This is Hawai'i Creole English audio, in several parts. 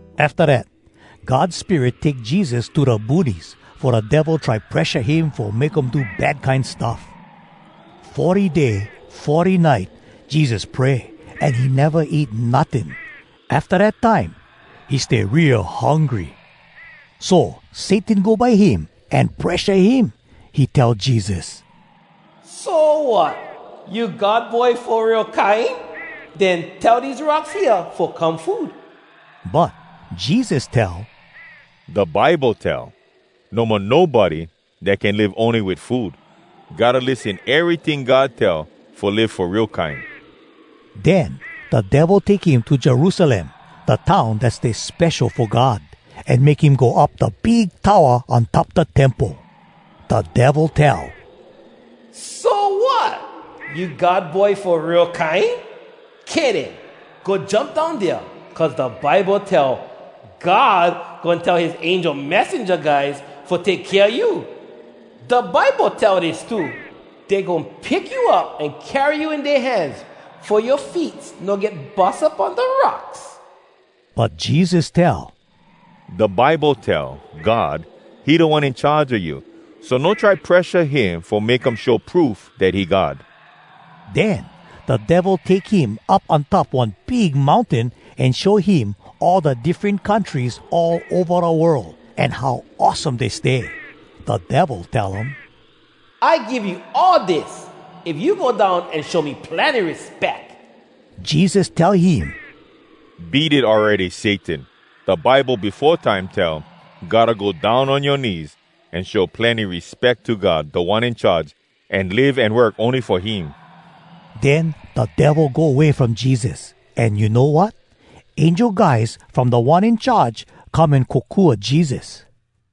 Afta dat, God Spirit take Jesus to da boonies, fo da Devil try presha him fo make um do bad kine stuff. Forty day, forty nite, Jesus pray an he neva eat notting. Afta dat time he stay real hungry. So Satan go by him an presha him. He tell Jesus, “So, wat? You God Boy fo real kine? Den tell dese rocks hea fo come food.” But Jesus tell, “Da Bible tell, “‘No mo nobody dat can live ony wit food, Gotta lissen eryting God tell, Fo live fo real kine.’” Den da Devil take him to Jerusalem, da town dat stay spesho fo God, an make him go up da big towa on top da temple. Da Devil tell, “So, wat? You God Boy fo real kine? Kay den, go jump down dea, cuz da Bible tell, “‘God goin tell his angel messenja guys fo take kea you.’ “Da Bible tell dis too: “‘Dey goin pick you up an carry you in dea hands, Fo yoa feets no get bus up on da rocks.’” But Jesus tell, “Da Bible tell: ‘God, he Da One In Charge a you. So no try presha him fo make um show proof dat he God.’” Den da Devil take him up on top one big mountain, an show him all da diffren countries all ova da world, an how awesome dey stay. Da Devil tell um, “I give you all dis, if you go down an show me plenny respeck.” Jesus tell him, “Beat it awready, Satan! Da Bible befo time tell, “‘Gotta go down on yoa knees An show plenny respeck to God, Da One In Charge, An live an work ony fo him.’” Den da Devil go way from Jesus, an you know wat? Angel guys from Da One In Charge come an kokua Jesus.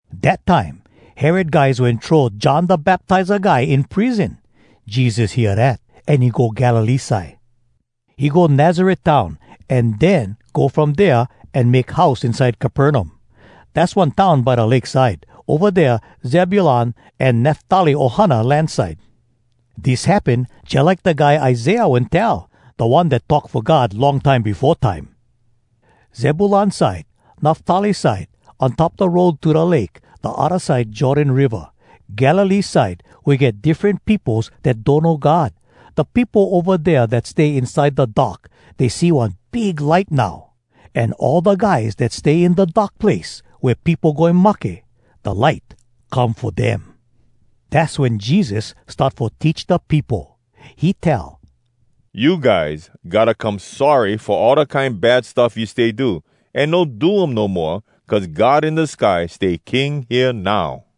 Dat time, Herod guys wen throw John Da Baptiza guy in prison. Jesus hear dat, an he go Galilee side. He go Nazaret town, an den go from dea, an make house inside Capernaum. Dass one town by da lake side, ova dea Zebulun an Naftali ohana land side. Dis happen jalike da guy Isaiah wen tell, da one dat talk fo God long time befo time: “Zebulun side, Naftali side, On top da road to da lake, da odda side Jordan Riva, Galilee side wea get diffren peopos dat donno God, Da peopo ova dea dat stay inside da dark, Dey see one big light now. An all da guys dat stay In da dark place wea peopo goin mahke, Da light come fo dem.” Dass wen Jesus start fo teach da peopo. He tell, “You guys gotta come sorry fo all da kine bad stuff you stay do, an no do um no moa, cuz God in da sky stay King hea now.”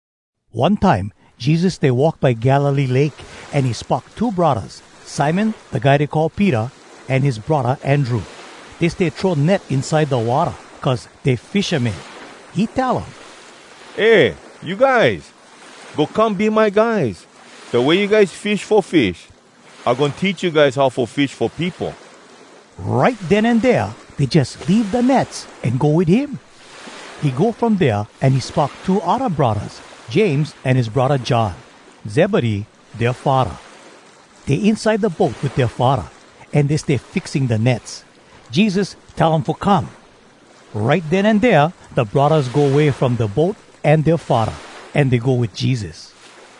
One time Jesus stay walk by Galilee Lake, an he spock two braddahs, Simon da guy dey call Peter, an his braddah Andrew. Dey stay throw net inside da watta, cuz dey fishamen. He tell um, “Eh, you guys! Go come be my guys! Da way you guys fish fo fish, I goin teach you guys how fo fish fo peopo!” Right den an dea, dey jus leave da nets an go wit him. He go from dea an he spock two odda braddahs, James an his braddah John. Zebedee, dea faddah. Dey inside da boat wit dea faddah, an dey stay fixing da nets. Jesus tell um fo come. Right den an dea da braddahs go way from da boat an dea faddah, an dey go wit Jesus.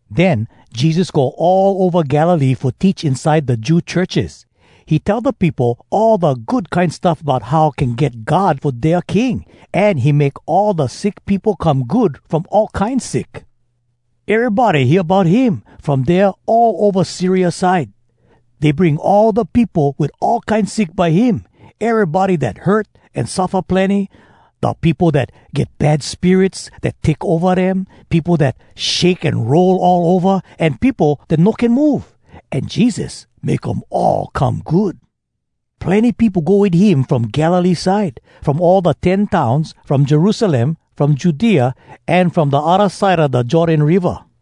Den Jesus go all ova Galilee fo teach inside da Jew churches. He tell da peopo all da Good Kine Stuff bout how can get God fo dea king, an he make all da sick peopo come good from all kine sick. Erybody hear bout him, from dea all ova Syria side. Dey bring all da peopo wit all kine sick by him: erybody dat hurt, an suffa plenny, da peopo dat get bad spirits dat take ova dem, peopo dat shake an roll all ova, an peopo dat no can move. An Jesus make um all come good. Plenny peopo go wit him from Galilee side, from all da Ten Towns, from Jerusalem, from Judea, an from da odda side a da Jordan Riva.